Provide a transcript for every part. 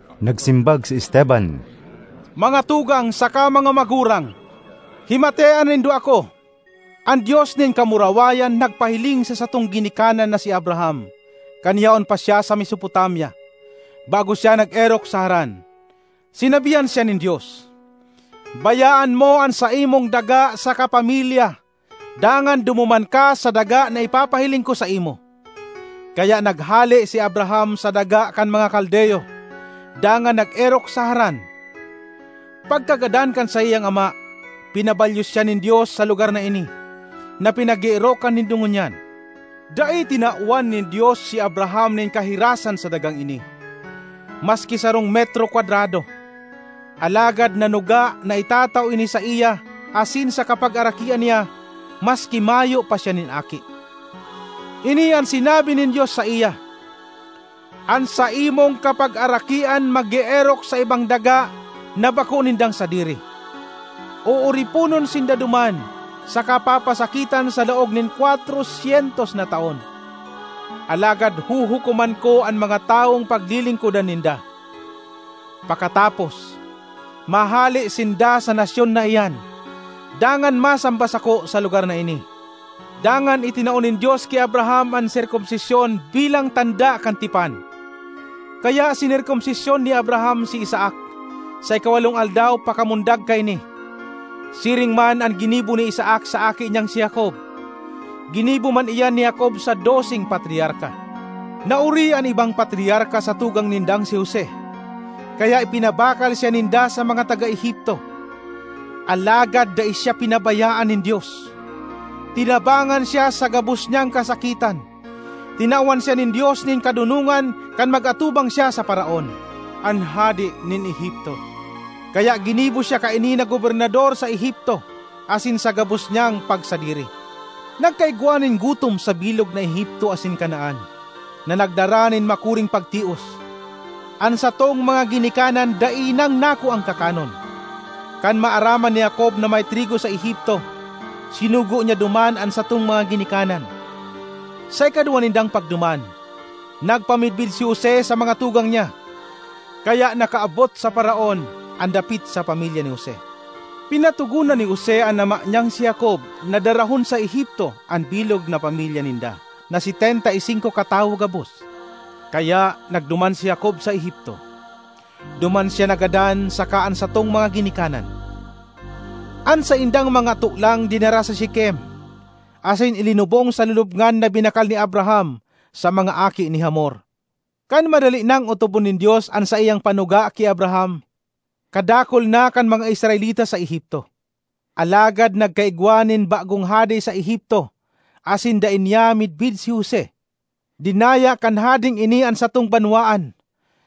Nagsimbag si Esteban, “Mga tugang saka mga magurang, himatea nindo ako! An Dios nin kamurawayan nagpahiling sa satong ginikanan na si Abraham kan yaon pa siya sa Mesopotamia, bago siya nag-erok sa Haran. Sinabihan siya nin Dios, ‘Bayaan mo an saimong daga saka pamilya dangan dumuman ka sa daga na ipapahiling ko saimo.’ Kaya naghale si Abraham sa daga kan mga Kaldeo dangan nag-erok sa Haran. Pagkagadan kan saiyang ama, pinabalyo siya nin Dios sa lugar na ini, na pinag-eerokan nindo ngunyan. Dai tinawan nin Dios si Abraham nin kahirasan sa dagang ini, maski sarong metro kwadrado, alagad nanuga na itatao ini saiya asin sa kapagarakian niya maski mayo pa siya nin aki. Ini an sinabi nin Dios saiya, ‘An saimong kapagarakian mag-eerok sa ibang daga na bako nindang sadiri. Ooriponon sinda duman saka papasakitan sa laog nin kwatro syentos na taon. Alagad huhukoman ko an mga tawong paglilingkodan ninda. Pakatapos, mahale sinda sa nasyon na iyan dangan masamba sako sa lugar na ini.’ Dangan itinao nin Dios ki Abraham an serkomsisyon bilang tanda kan tipan. Kaya sinerkomsisyon ni Abraham si Isaac sa ikawalong aldaw pakamundag kaini; siring man an ginibo ni Isaac sa aki niyang si Jacob. Ginibo man iyan ni Jacob sa doseng patriarka. ”Naori an ibang patriarka sa tugang nindang si Jose, kaya ipinabakal siya ninda sa mga taga Egipto. Alagad dai siya pinabayaan nin Dios; tinabangan siya sa gabos niyang kasakitan. Tinawan siya nin Dios nin kadonongan kan mag-atubang siya sa Faraon, an hade nin Egipto. Kaya ginibo siya kaini na gobernador sa Egipto asin sa gabos niyang pagsadiri. Nagkaigwa nin gutom sa bilog na Egipto asin Canaan, na nagdara nin makuring pagtios. An satong mga ginikanan dai nang nakuang kakanon. Kan maaraman ni Jacob na may trigo sa Egipto, sinugo niya duman an satong mga ginikanan. Sa ikaduwa nindang pagduman, nagpamidbid si Jose sa mga tugang niya, kaya nakaabot sa Faraon an dapit sa pamilya ni Jose. Pinatogonan ni Jose an ama niyang si Jacob na darahon sa Egipto an bilog na pamilya ninda, na setenta y singko katawo gabos. Kaya nagduman si Jacob sa Egipto; duman siya nagadan saka an satong mga ginikanan. An saindang mga tolang dinara sa Shekem, asin ilinubong sa lulubngan na binakal ni Abraham sa mga aki ni Hamor. ”Kan madali nang otobon nin Dios an saiyang panuga ki Abraham, kadakul na kan mga Israelita sa Egipto. Alagad nagkaigwa nin bagong hade sa Egipto asin dai niya midbid si Jose. Dinaya kan hadeng ini an satong banwaan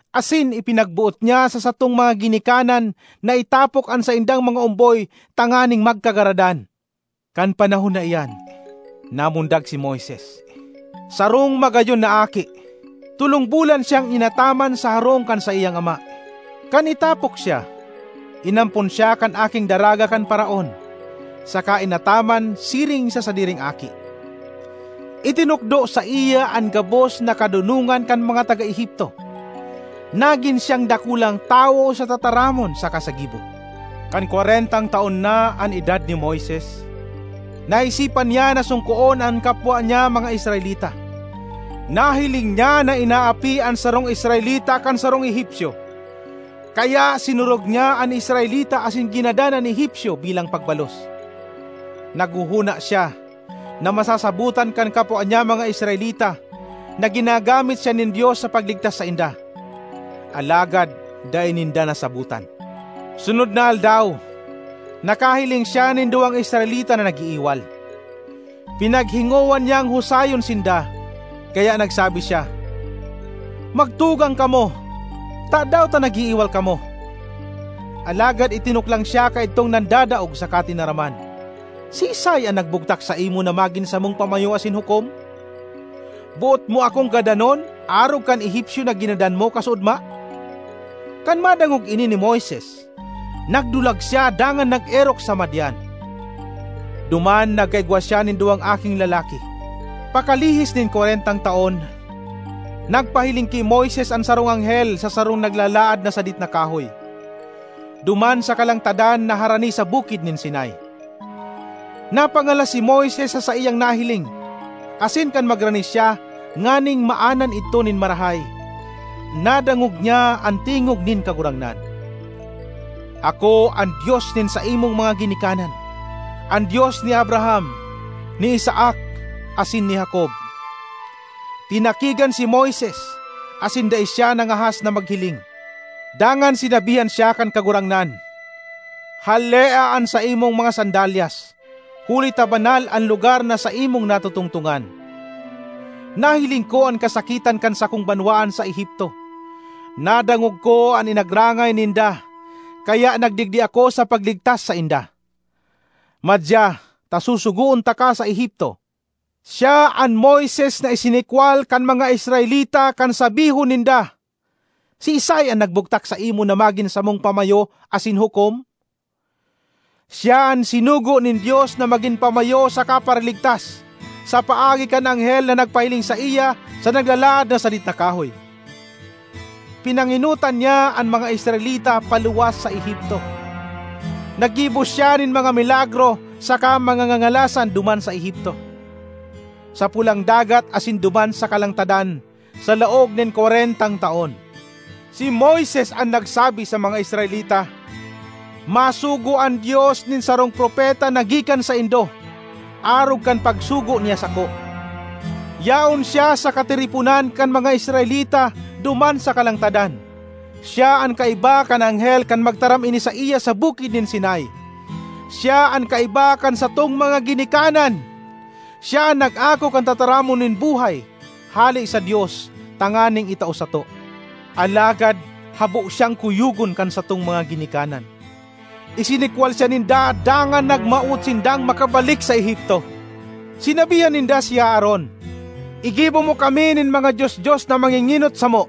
asin ipinagboot niya sa satong mga ginikanan na itapok an saindang mga omboy tanganing magkagaradan. Kan panahon na iyan namundag si Moises, sarong magayon na aki. Tolong bulan siyang inataman sa harong kan saiyang ama. Kan itapok siya, inampon siya kan aking daraga kan Faraon saka inataman siring sa sadiring aki. Itinukdo saiya an gabos na kadonongan kan mga taga Egipto; nagin siyang dakulang tawo sa tataramon saka sa gibo. ”Kan kwarentang taon na an edad ni Moises, naisipan niya na songkoon an kapwa niya mga Israelita. Nahiling niya na inaapi an sarong Israelita kan sarong Egipcio. Kaya sinurog niya an Israelita asin ginadan an Egipcio bilang pagbalos. (Naghohona siya na masasabotan kan kapwa niya mga Israelita na ginagamit siya nin Dios sa pagligtas sainda; alagad dai ninda nasabotan.) Sunod na aldaw, nakahiling siya nin duwang Israelita na nag-iiwal. Pinaghingowa niyang husayon sinda, kaya nagsabi siya, ‘Magtugang kamo; tadaw ta nag-iiwal kamo?’ Alagad itinuklang siya kaidtong nandadaog saka tinaraman, ‘Siisay an nagbugtak saimo na magin samong pamayo asin hukom? Boot mo akong gadanon arog kan Egipcio na ginadan mo kasuodma?’ Kan madangog ini ni Moises, nagdulag siya dangan nag-erok sa Madian. Duman nagkaigwa siya nin duwang aking lalaki. ”Pakalihis nin kwarentang taon, nagpahiling ki Moises an sarong anghel sa sarong naglalaad na sadit na kahoy, duman sa kalangtadan na harani sa Bukid nin Sinai. Napangalas si Moises sa saiyang nahiling asin kan magrani siya nganing maanan idto nin marahay, nadangog niya an tingog nin Kagurangnan: ‘Ako an Dios nin saimong mga ginikanan, an Dios ni Abraham, ni Isaac asin ni Jacob.’ Tinakigan si Moises, asin dai siya nangahas na maghiling. Dangan sinabihan siya kan Kagurangnan, ‘Halea an saimong mga sandalyas huli ta banal an lugar na saimong natotongtongan. Nahiling ko an kasakitan kan sakong banwaan sa Egipto. Nadangog ko an inagrangay ninda kaya nagdigdi ako sa pagligtas sainda. Madya ta susugoon taka sa Egipto.’ ”Siya an Moises na isinikwal kan mga Israelita kan sabihon ninda, ‘Siisay an nagbugtak saimo na magin samong pamayo asin hukom?’ Siya an sinugo nin Dios na magin pamayo saka paraligtas, sa paagi kan anghel na nagpahiling saiya sa naglalaad na sadit na kahoy. Pinangenotan niya an mga Israelita paluwas sa Egipto; naggibo siya nin mga milagro saka mga ngangalasan duman sa Egipto, sa Pulang Dagat asin duman sa kalangtadan sa laog nin kwarentang taon. Si Moises an nagsabi sa mga Israelita, ‘Masugo an Dios nin sarong propeta na gikan saindo, arog kan pagsugo niya sako.’ Yaon siya sa katiriponan kan mga Israelita duman sa kalangtadan; siya an kaiba kan anghel kan magtaram ini saiya sa Bukid nin Sinai; siya an kaiba kan satong mga ginikanan. Siya an nag-ako kan tataramon nin buhay hale sa Dios tanganing itao sato. ”Alagad habo siyang kuyogon kan satong mga ginikanan; isinikwal siya ninda dangan nagmawot sindang makabalik sa Egipto. Sinabihan ninda si Aaron, ‘Igibo mo kami nin mga dios-dios na mangengenot samo,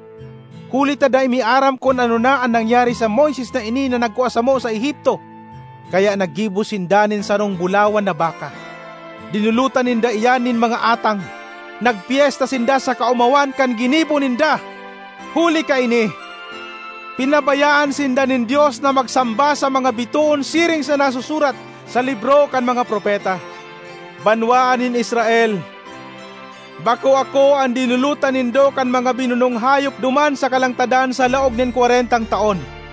huli ta dai mi aram kun ano na an nangyari sa Moises na ini na nagkua samo sa Egipto.’ Kaya naggibo sinda nin sarong bulawan na baka. Dinolotan ninda iyan nin mga atang; nagpyesta sinda sa kaomawan kan ginibo ninda. Huli kaini pinabayaan sinda nin Dios na magsamba sa mga bitoon siring sa nasusurat sa libro kan mga propeta, ‘Banwaan nin Israel, bako ako an dinolotan nindo kan mga binunong hayop duman sa kalangtadan sa laog nin kwarentang taon.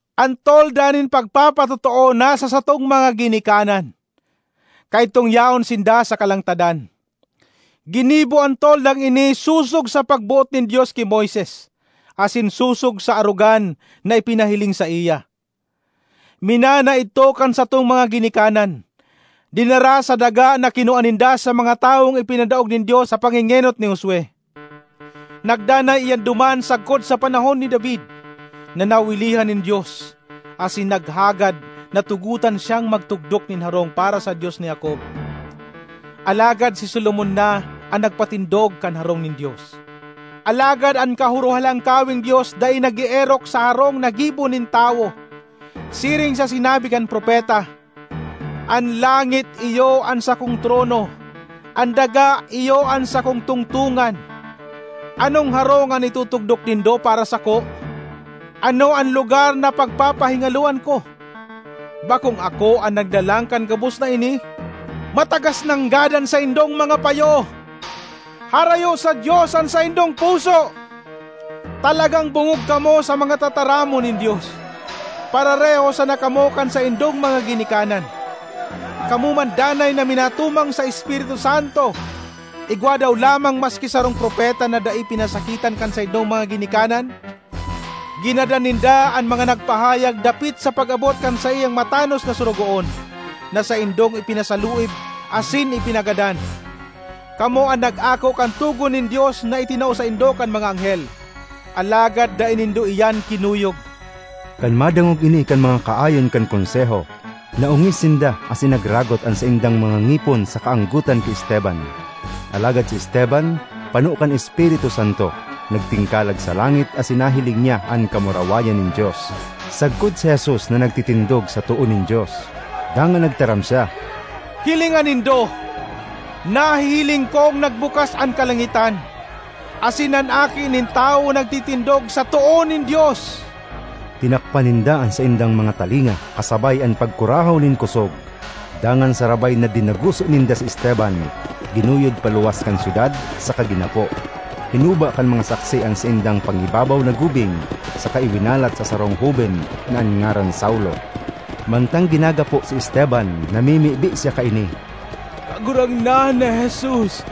”An Tolda nin pagpatotoo nasa satong mga ginikanan kaidtong yaon sinda sa kalangtadan. Ginibo an toldang ini sosog sa pagboot nin Dios ki Moises, asin sosog sa arogan na ipinahiling saiya. Minana idto kan satong mga ginikanan, dinara sa daga na kinua ninda sa mga tawong ipinadaog nin Dios sa pangengenot ni Josue. Nagdanay iyan duman sagkod sa panahon ni David na nawilihan nin Dios asin naghagad na tugotan siyang magtugdok nin harong para sa Dios ni Jacob. Alagad si Solomon na an nagpatindog kan harong nin Dios. ”Alagad an Kahorohalangkaweng Dios dai nag-eerok sa harong na gibo nin tawo, siring sa sinabi kan propeta, ‘An langit iyo an sakong trono, an daga iyo an sakong tungtongan. Anong harong an itutugdok nindo para sako? Ano an lugar na pagpapahingaloan ko? Bakong ako an naglalang kan gabos na ini?’ ”Matagas nanggad an saindong mga payo! Harayo sa Dios an saindong puso! Talagang bongog kamo sa mga tataramon nin Dios! Parareho sana kamo kan saindong mga ginikanan; kamo man danay na minatumang sa Espiritu Santo! Igwa daw lamang maski sarong propeta na dai pinasakitan kan saindong mga ginikanan? Ginadan ninda an mga nagpahayag dapit sa pag-abot kan saiyang Matanos na Sorogoon, na saindong ipinasaluib asin ipinagadan. Kamo an nag-ako kan togon nin Dios na itinao saindo kan mga anghel—alagad dai nindo iyan kinuyog!” Kan madangog ini kan mga kaayon kan Konseho, naongis sinda asin nagragot an saindang mga ngipon sa kaanggotan ki Esteban. Alagad si Esteban, pano kan Espiritu Santo, nagtingkalag sa langit asin nahiling niya an kamurawayan nin Dios, sagkod si Jesus na nagtitindog sa too nin Dios. Dangan nagtaram siya, “Hilinga nindo! Nahihiling kong nagbukas an kalangitan, asin an Aki nin Tawo nagtitindog sa too nin Dios!” Tinakpan ninda an saindang mga talinga, kasabay an pagkurahaw nin kosog. Dangan sarabay na dinaguso ninda si Esteban, ginuyod paluwas kan syudad saka ginapo. Hinuba kan mga saksi an saindang pangibabaw na gubing saka iwinalat sa sarong hoben na an ngaran Saulo. Mantang ginagapo si Esteban, namimibi siya kaini, “Kagurangnan na Jesus,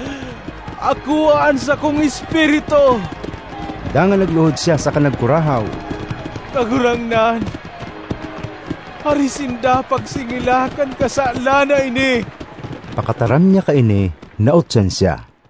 akoa an sakong espiritu!” Dangan nagluhod siya saka nagkurahaw, “Kagurangnan, hare sinda pagsingila kan kasalan na ini!” Pakataram niya kaini nautsan siya.